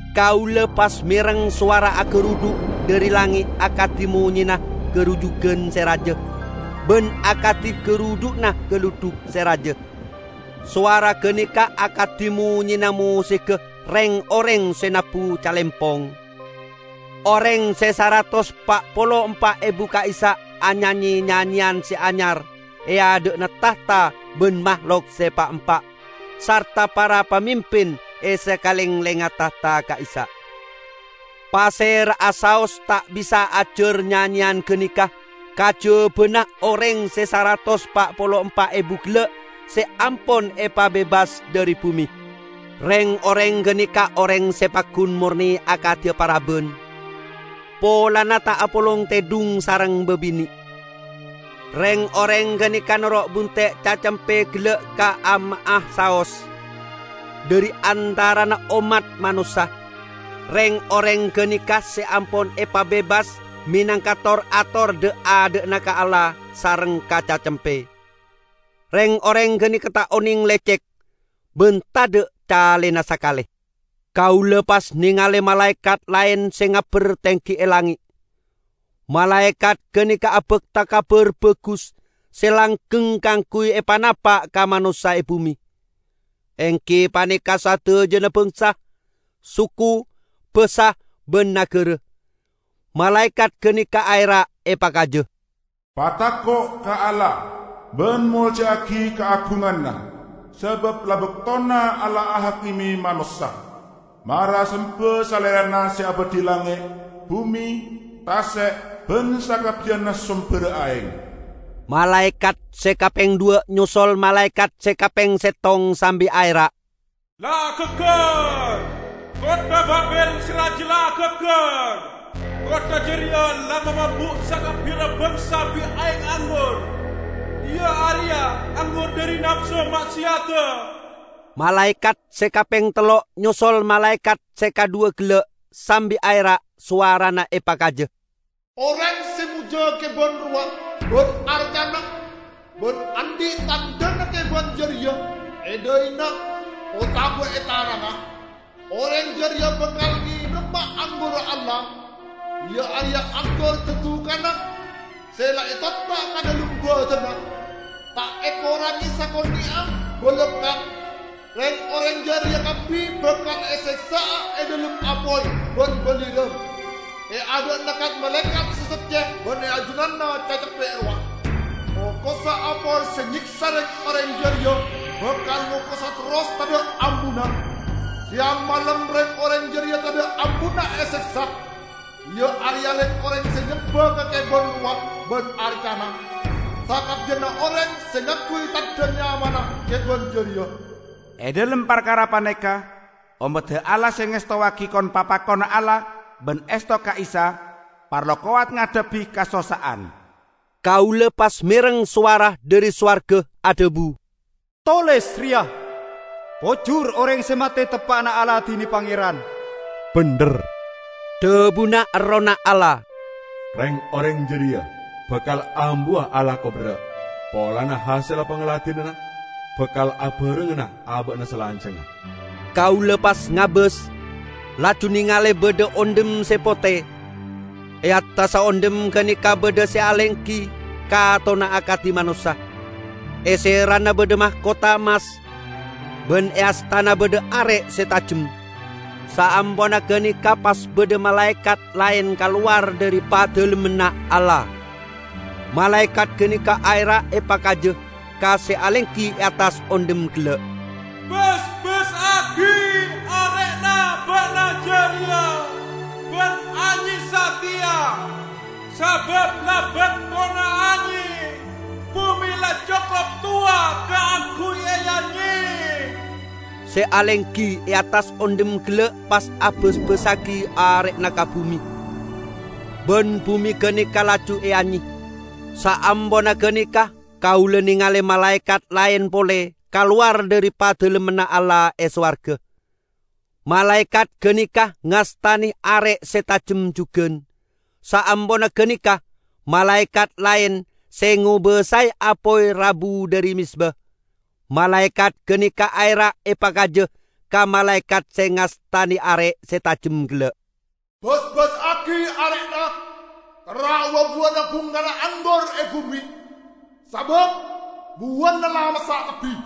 Kaula pas mereng sowara agarudhu' dhari langnge' akadi monyena garujugan se raja ban akadi garudhu'na galudhuk se raja. Sowara ganeka akadi monyena mosigga reng-oreng se nabbu calempong. Oreng se saratos pa' polo empa' ebu ka'issa' anyanye nyanyeyan se anyar e adha'na tahta ban mahlok se pa'-empa' sarta para pamimpin e sakalenglengnga tahta ka'issa'. Pasera'a saos ta' bisa ajar nyanyeyan ganeka kajabana oreng se saratos pa' polo empa' ebu gella' se ampon epabebas dhari bume. Reng-oreng ganeka oreng se paggun morne akadi paraban, polana ta' apolong tedhung sareng babine'. Reng-oreng ganeka noro' bunte' Cacempe gella' ka'amma'a saos. Dhari antarana ommat manossa, reng-oreng ganeka se ampon epabebas menangka tor-ator dha'-adha'na ka Allah sareng ka Cacempe. Reng-oreng ganeka ta' oneng lecek; ban tadha' calena sakale. Kaula pas nengale malaekat laen se ngabber tenggi e langnge'. Malaekat ganeka abakta Kabar Bagus se langgeng kaangguy epanapa' ka manossa e bume, enggi paneka sadajana bangsa, suku, basa ban nagara. Malaekat ganeka aera' epakaja, "Patako' ka Allah, ban molja'agi kaagunganna! Sabab la baktona Allah ahakime manossa. Mara semba Salerana se abadhi langnge', bume, tase' ban sakabbiyanna somberra aeng!" Malaekat se kapeng dhuwa' nyosol malaekat se kapeng settong sambi aera', "La gaggar! Kottha Babil se raja la gaggar! Kottha jareya la mamabu' sakabbiyanna bangsa bi' aeng anggur -- iya areya anggur dhari napso ma'seyadda!" Malaekat se kapeng tello' nyosol malaekat se kadhuwa gella', sambi aera', sowarana epakaja, "Oreng se mojja keban rowa ban arcana, ban andhi' tandhana keban jareya e dhaina otaba e tanangnga, oreng jareya bakal ngenoma anggurra Allah, iya areya anggur dadukanna se la etotta' ka dhalem baddhana, ta' ekorange sakone'a balakka'! Reng-oreng jareya kabbi bakal eseksa'a e dhalem apoy ban balirang e adha'na kat-malaekat se socce ban e ajunanna Cacempe rowa. Okossa apoy se nyeksa reng-oreng jareya bakal ngokosa terros tadha' ambuna. Seyang malem reng-oreng jareya tadha' ambuna eseksa, iya areya reng-oreng se nyemba ka keban rowa ban arcana, sakabbiyanna oreng se ngangguy tandha nyamana keban jareya." E dhalem parkara paneka ommadda Allah se ngestowagi kon-papakonna Allah ban esto ka Isa, parlo kowat ngadhebbi kasossa'an. Kaula pas mereng sowara dhari sowarga adhabu, "Toles reya: Pojur oreng se mate teppa'na aladine Pangeran!" "Bendher!" dhabuna Errohna Allah. "Reng-oreng jareya bakal ambuwa alako berra', polana hasella pangladinanna bakal abarengngana aba'na salanjangnga." Kaula pas ngabas, laju nengale badha ondhem se pote. E attassa ondhem ganeka badha se alenggi, katonna akadi manossa. E serana badha makotha emmas, ban e astana badha are' se tajem. Saamponna ganeka pas badha malaekat laen kalowar dhari Padalemmanna Allah. Malaekat ganeka aera' epakaja ka se alenggi e attas ondhem gella', "Basbassagi are'na ba'na jareya ban anye sateya, sabab la baktona anye; bume la cokop towa kaangguy eanye!" Se alenggi e attas ondhem gella' pas abasbassagi are'na ka bume, ban bume ganeka laju eanye. Saamponna ganeka kaula nengale malaekat laen pole kalowar dhari Padalemmanna Allah e sowarga. Malaekat ganeka ngastane are' se tajem jugan. Saamponna ganeka, malaekat laen, se ngobasae apoy rabu dhari mezba. Malaekat ganeka aera' epakaja ka malaekat se ngastane are' se tajem gella', "Basbassagi are'na, kerra' wa-buwana bungkana anggur e bume, sabab buwana la massa' kabbi!"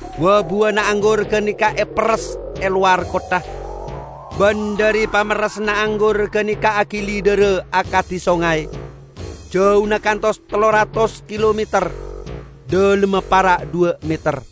Wa-buwana anggur ganeka eperres e lowar kottha, ban dhari pamerresanna anggur ganeka agili dhara akadi songay, jauna kantos tello ratos kilometer, dhalemma para' dhuwa' meter.